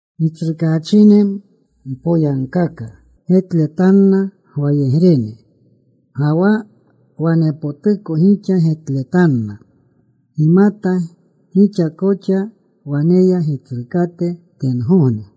Gitsrukaachine, mpoyagkaka getletanna gwayegrene, ga wa wanepotuko gixa getletanna. Gimata gixa koxa waneya Gitsrukate tengogne.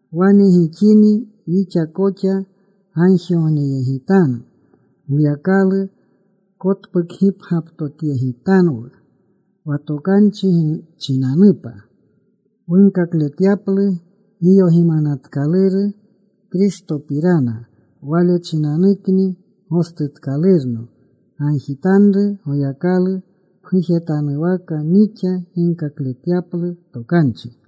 Wane gixini wixa koxa gagjigogneyegitanu, Goyakalu kotpukgipgyaptotyegitanwu wa tokanchi chinanupa wunkakletyaplu giyogimanatkaluru Kristopirana. Wale chinanukni gostutkalurno. Gagjitanru Goyakalu pgujetanuwaka nixa ginkakletyaplu tokanchi.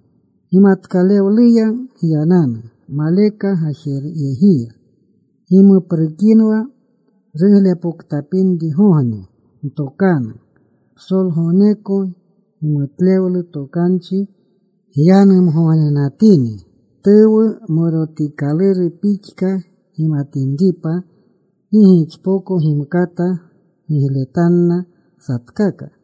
Gimatkalewleya gyananu maleka gajenyegiya. Gimuprekinwa ruglepoktapinrigogne. Ntokanu psolgogneko gimutlewlu tokanchi gyanumgognenatini, tuwu morotikaluru pixka, gimatinripa gi gixpoko gimkata gigletanna satkaka.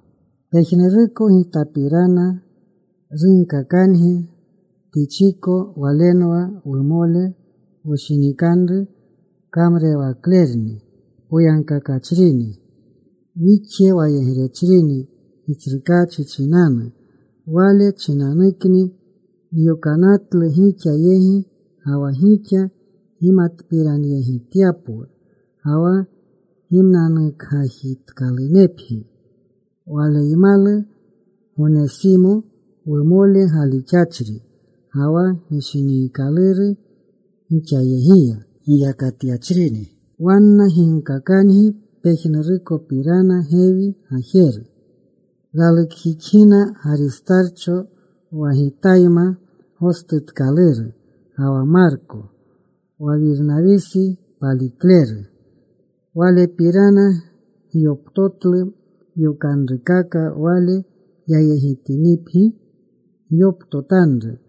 Pejnuruko gitapirana runkakangi Tichiko. Walenwa wumole wushinikanru. Kamrurewaklerni poyagkakachrini. Wixje wayegrechrini Gitsrukaachi chinanu. Wale chinanukni nyokanatlu gixa yegi, wa gixa gimatpiranyegityapwu ga wa gimnanukgajitkalunepgi. Waleymalu Gonesimo wumole, galixachri ga wa gishiniikaluru. Gixayegiya giyakatyachrini. Wanna ginkakangi pejnurukopirana gewi gajeru. Ralukjixgina Garistarcho, wa gitayma gostutkaluru, ga wa Marko wa Wirnawisi palikleru. Walepirana gyoptotlu yokanrukaka. Wale yayegitinipgi, gyoptotanru.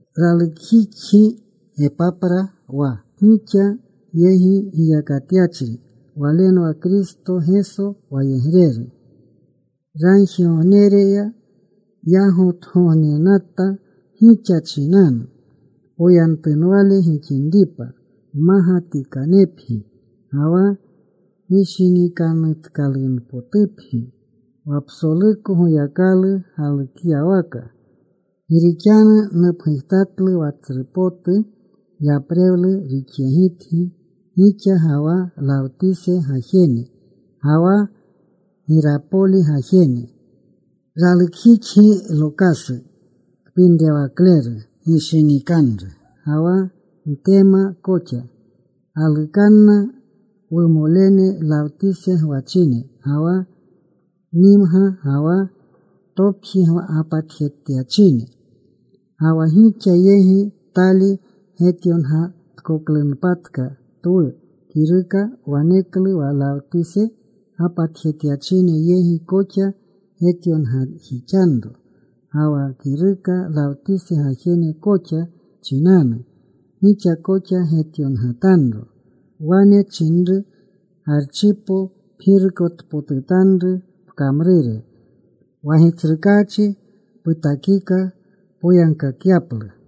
Ralukjixgi Gepapra wa gixa yegi giyakatyachri. Walenwa Kristo Geso wayegreru. Ragjigognereya yagotgognenata gixa chinanu, poyentunwale gixinripa, mmagatikanepgi ga wa gishinikanutkalunpotupgi wa psoluko Goyakalu galukyawaka. Gi rixanu nupgujtatlu wa tsru potu yaprewlu rixyegitgi gixa ga wa Lawtise gajene, ga wa Girapoli gajene. Ralukjixgi Lokasu, kpinrewakleru gishiniikaluru ga wa Ntema koxa. Galukanna wumolene Lawtise gwachine, ga wa Nimga, ga wa topji gapatjetyachine. Ga wa gixa yegi tali getyongatkoklunpatka twu kiruka, waneklu wa Lawtise gapatjetyachine yegi koxa getyongajixanro. Ga wa kiruka Lawtise gajene koxa chinanu, gixa koxa getyongatanro. Wane nchinanru Garchipo, “Pgirukotpotutanru pkamrure wa Gitsrukaachi putakika, poyagkakyaplu.”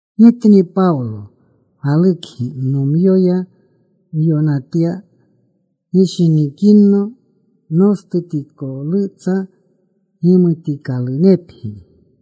Gitni Pawlo galukgi. Nomyoya nyonatya. Gishinikinno nostutikolutsa. Gimutikalunepgi.